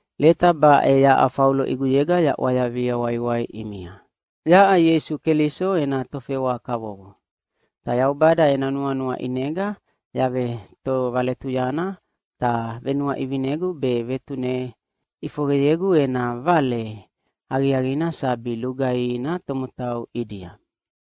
Leta baʼe yaʼa Faulo ʼiguyega yaʼwayavia waiwai ʼimia. Yaʼa Ieisu Keliso ena tofewa kavovo. Ta Yaubada ena nuanua ʼinega yavetovaletuyana, ta venuaʼivinegu be vetune ʼifoqeyegu ena Vale Aqiaqina sabi lugaihina tomotau ʼidia.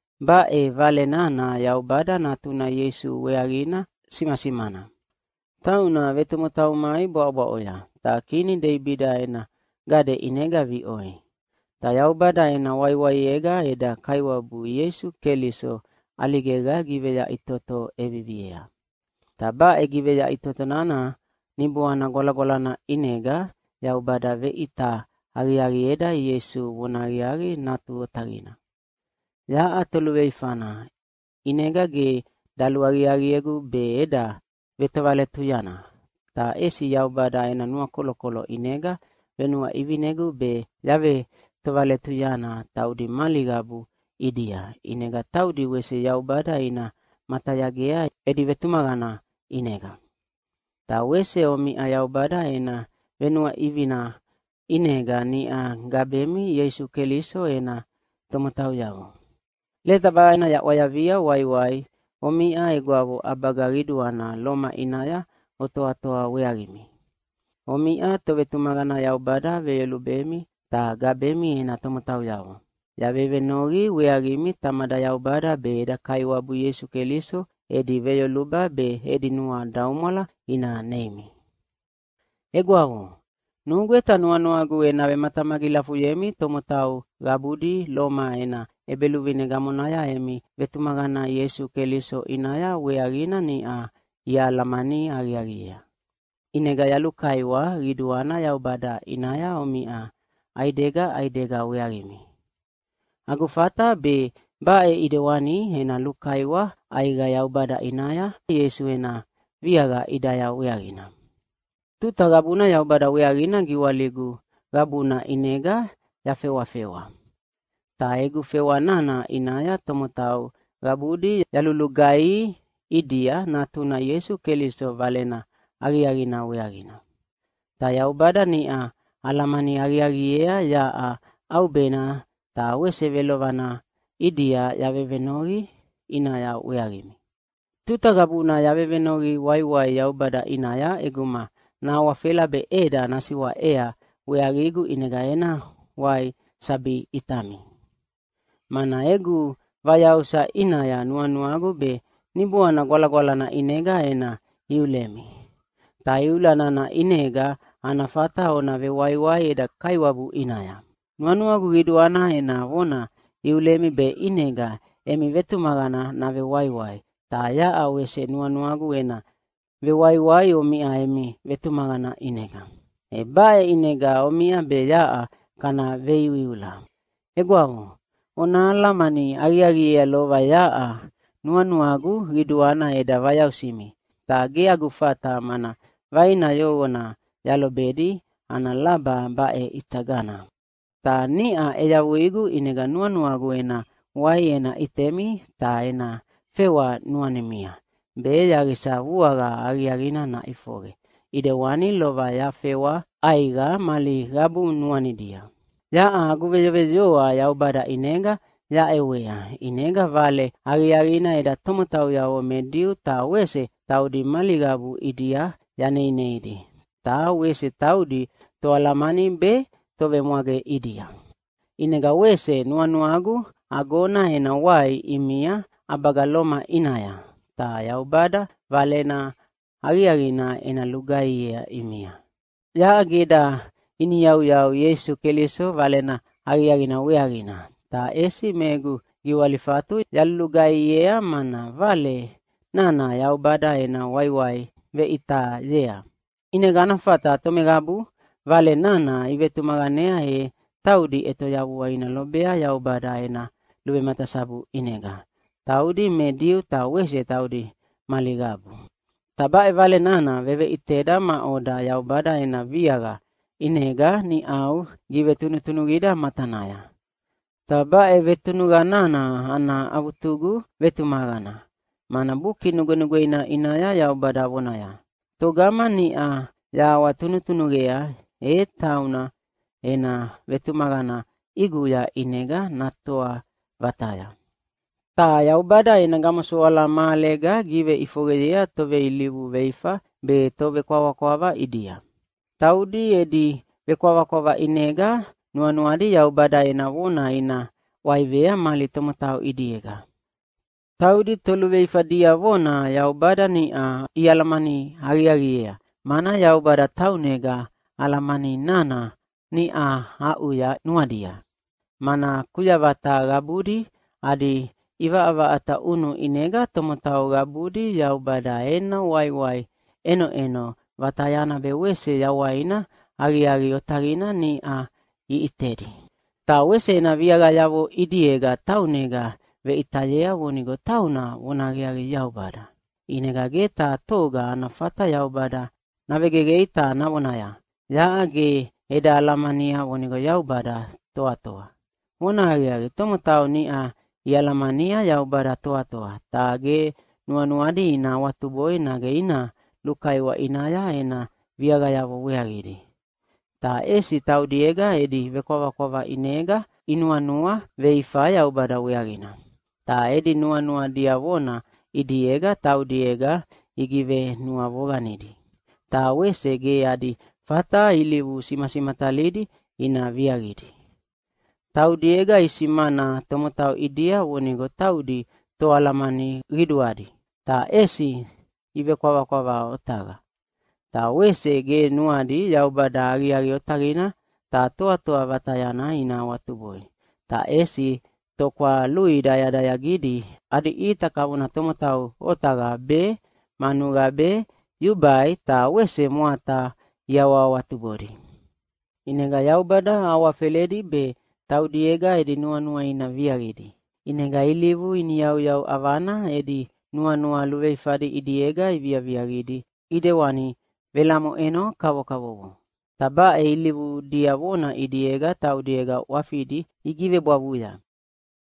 Baʼe Vale nana Yaubada Natuna Ieisu weaqina simasimana. Tauna vetomotau mai bwaʼobwaʼoya, ta kini Deibida ena gade ʼinega viʼoi. Ta Yaubada ena waiwaiega eda Kaiwabu Ieisu Keliso ʼaligega giveyaʼitoto ʼeviviea. Ta baʼe giveyaʼitoto nana Niboana Gwalagwalana ʼinega Yaubada veʼita aqiaqieda Ieisu vonahaqiaqi Natu Otaqina. Yaʼa toluveifana, ʼinega ge daluaqiaqiegu be eda vetovaletuyana, ta ʼesi Yaubada ena nuakolokolo ʼinega venuaʼivinegu be yavetovaletuyana taudi mali qabu ʼidia, ʼinega taudi wese Yaubada ina matayagea edi vetumaqana ʼinega. Ta wese omiʼa Yaubada ena venuaʼivina ʼinega niʼa gabemi Ieisu Keliso ena tomotauyavo. Leta baʼena yaʼwayavia waiwai omiʼa egwavo ʼabaga qiduana Loma ʼinaya otoatoa weaqimi. Omiʼa tovetumaqana Yaubada veyolubemi ta gabemi ena tomotauyavo. Yavevenoqi weaqimi Tamada Yaubada be eda Kaiwabu Ieisu Keliso edi veyoluba be edi nuadaumwala ina neimi. Egwavo, nugweta nuanuagu ena vematamagilafuyemi tomotau qabudi Loma ena ʼebeluvine gamonaya emi vetumaqana Ieisu Keliso ʼinaya weaqina niʼa ialamani aqiaqiea. ʼInega yalulukaiwa qiduana Yaubada ʼinaya omiʼa ʼaidega ʼaidega weaqimi. Agu fata be baʼe ʼidewani ena lukaiwa ʼaiqa Yaubada ʼinaya Ieisu ena viaqa ʼidaya weaqina. Tuta qabuna Yaubada weaqina giwaligu qabuna ʼinega yafewafewa. Ta egu fewa nana ʼinaya tomotau qabudi yalulugaihi ʼidia Natuna Ieisu Keliso Valena Aqiaqina weaqina. Ta Yaubada niʼa alamani aqiaqiea yaʼa ʼaubena ta wese velovana ʼidia yavevenoqi ʼinaya weaqimi. Tuta qabuna yavevenoqi waiwai Yaubada ʼinaya ʼeguma nahawafela be ʼeda nasiwaʼea weaqigu ʼinega ena wai sabi ʼitami. Mana egu vayausa ʼinaya nuanuagu be Niboana Gwalagwalana ʼinega ena iulemi. Ta iula nana ʼinega ana fata ona vewaiwai eda Kaiwabu ʼinaya. Nuanuagu qiduana ena vona iulemi be ʼinega emi vetumaqana navewaiwai, ta yaʼa wese nuanuagu ena vewaiwai omiʼa emi vetumaqana ʼinega. E baʼe ʼinega omiʼa be yaʼa kana veiuiula. Egwavo, ona alamani aqiaqiea lova yaʼa nuanuagu qiduana eda vayausimi, ta ge agu fata mana vaina yoqona yalobedi ana laba baʼe ʼitagana. Ta niʼa ʼeyavuigu, ʼinega nuanuagu ena wai ena ʼitemi ta ena fewa nuanimia, be yaqisa vuaqa aqiaqina naʼifoqe, ʼidewani lova yafewa ʼaiqa mali qabu nuanidia. Yaʼa agu veyoveyoa Yaubada ʼinega yaʼewea, ʼinega Valena Aqiaqina eda tomotauyavo me Diu ta wese taudi mali qabu ʼidia yaneineidi, ta wese taudi toalamani be tovemwage ʼidia. ʼInega wese nuanuagu agona ena wai ʼimia ʼabaga Loma ʼinaya, ta Yaubada Valena Aqiaqina ena lugaihiea ʼimia. Yaʼa ge eda iniyauyau Ieisu Keliso Valena Aqiaqina weaqina, ta ʼesi me egu giwalifatu yalulugaihiea, mana Vale nana Yaubada ena waiwai veʼitayea, ʼinega ana fata tomeqabu Vale nana ivetumaqanea e taudi ʼetoyavua ina lobea Yaubada ena luvematasabu ʼinega — taudi me Diu ta wese taudi mali qabu. Ta baʼe Vale nana veveʼiteda maʼoda Yaubada ena viaqa ʼinega niʼau givetunutunuqida matanaya. Ta baʼe vetunuqa nana ana avutugu vetumaqana, mana Buki Nugwenugweina ʼinaya Yaubada vonaya, “Togama niʼa yahawatunutunuqea, e tauna ena vetumaqana ʼiguya ʼinega natoa vataya.” Ta Yaubada ena gamosoala mahalega giveʼifoqeyea toveilivu veifa be tovekwavakwava ʼidia. Taudi edi vekwavakwava ʼinega nuanuadi Yaubada ena vona ina ʼwaivea mali tomotau ʼidiega. Taudi toluveifa diavona Yaubada niʼa ialamani aqiaqiea, mana Yaubada taunega alamani nana niʼa aʼuya nuadia. Mana kuyavata qabudi adi ʼivaʼavaʼata ʼunu ʼinega tomotau qabudi Yaubada ena waiwai ʼenoʼeno vatayana be wese yawaina aqiaqi otaqina niʼa iʼitedi. Ta wese ena viaqayavo ʼidiega taunega veʼitayea vonigo tauna vonahaqiaqi Yaubada. ʼInega ge taha toga ana fata Yaubada navegeqei ta navonaya, “Yaʼa ge eda alamania vonigo Yaubada toatoa.” Vonahaqiaqi, tomotau niʼa ialamania Yaubada toatoa, ta ge nuanuadi ina awatuboi nage ina lukaiwa ʼinaya ena viaqayavo weaqidi. Ta ʼesi taudiega edi vekwavakwava ʼinega inuanua veifa Yaubada weaqina. Ta edi nuanua diavona ʼidiega taudiega igivenuavoqanidi, ta wese ge adi fata ilivu simasimatalidi ina viaqidi. Taudiega isimana tomotau ʼidia vonigo taudi toalamani qiduadi, ta ʼesi ivekwavakwava otaqa. Ta wese ge nuadi Yaubada aqiaqi otaqina ta toatoa vatayana ina awatuboi, ta ʼesi tokwalui dayadayaqidi adi ʼita kavona tomotau otaqa be, manuqa be, yubai ta wese mwata iawahawatubodi. ʼInega Yaubada awafeledi be taudiega edi nuanua ina viaqidi. ʼInega ilivu iniyauyau ʼavana edi nuanua luveifadi ʼidiega iviaqidi ʼidewani velamoʼeno kavokavovo. Ta baʼe ilivu diavona ʼidiega taudiega ʼwafidi igivebwavuya.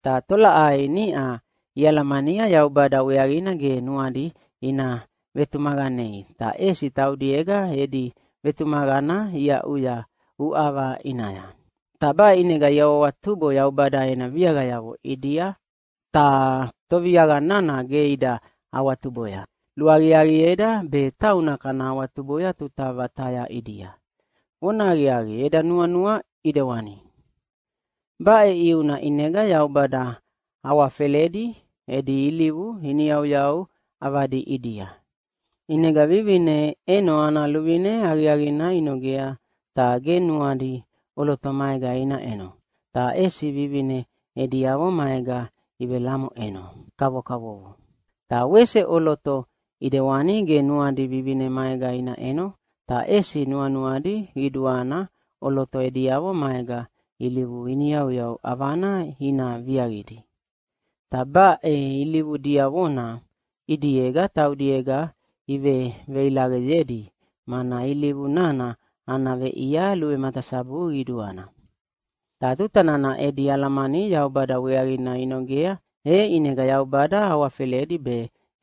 Ta tolaʼai niʼa ialamania Yaubada weaqina ge nuadi ina vetumaqanei, ta ʼesi taudiega edi vetumaqana iaʼuya uʼava ʼinaya. Ta baʼe ʼinega iawahawatubo Yaubada ena viaqayavo ʼidia, ta Toviaqa nana ge ida awatuboya. Luaqiaqieda be tauna kana awatuboya tuta vataya ʼidia. Vonahaqiaqi, eda nuanua ʼidewani. Baʼe ʼiuna ʼinega Yaubada awafeledi edi ilivu iniyauyau ʼavadi ʼidia. ʼInega vivine ʼeno ana luvine aqiaqina inogea ta ge nuadi ʼoloto maega ina ʼeno, ta ʼesi vivine ediavo maega ivelamoʼeno kavokavovo. Ta wese ʼoloto ʼidewani ge nuadi vivine maega ina ʼeno, ta ʼesi nuanuadi qiduana ʼoloto ediavo maega ilivu iniyauyau ʼavana ina viaqidi. Ta baʼe ilivu diavona ʼidiega taudiega iveveilaqeyedi, mana ilivu nana ana veʼia luvematasabu qiduana. Ta tuta nana edi alamani Yaubada weaqina inogea, e ʼinega Yaubada awafeledi be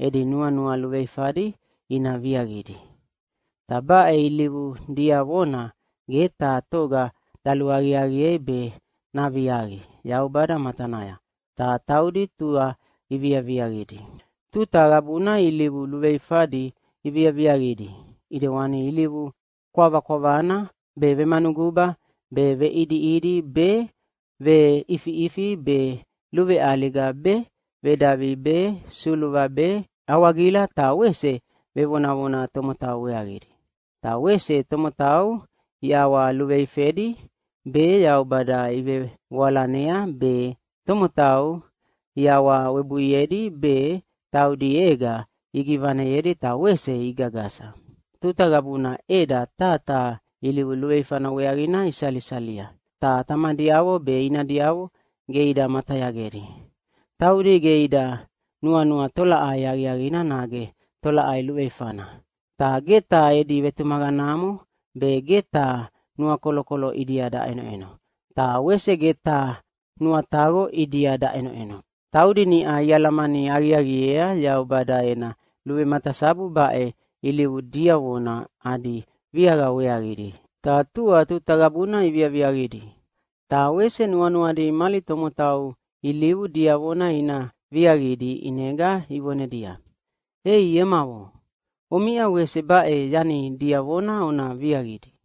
edi nuanua luveifadi ina viaqidi. Ta baʼe ilivu diavona ge taha toga daluaqiaqiei be naviaqi Yaubada matanaya, ta taudi tua iviaviaqidi. Tuta qabuna ilivu luveluveifadi iviaviaqidi, ʼidewani ilivu kwavakwavana be, vemanuguba be, veʼidiʼidi be, veʼifiʼifi be, luveʼaliga be, vedavi be, suluva be, awagila ta wese vevonavona tomotau weaqidi. Ta wese tomotau iʼawaluveifedi be, Yaubada ivevoalanea be, tomotau iawawebuiedi be, taudiega igivaneyedi ta wese igagasa. Tuta qabuna ʼeda taha taha ilivu luveifana weaqina isalisalia, ta tamadiavo be inadiavo ge ida matayagedi. Taudi ge ida nuanua tolaʼai aqiaqina nage tolaʼai luveifana. Ta ge taha edi vetumaqanamo be, ge taha nuakolokolo ʼidia daʼenoʼeno, ta wese ge taha nuataqo ʼidia daʼenoʼeno. Taudi niʼa ialamani aqiaqiea Yaubada ena luvematasabu baʼe ilivu diavona adi viaqa weaqidi, ta tua tuta qabuna iviaviaqidi. Ta wese nuanuadi mali tomotau ilivu diavona ina viaqidi ʼinega ivonedia, “Ei emavo, omiʼa wese baʼe yani diavona ona viaqidi!”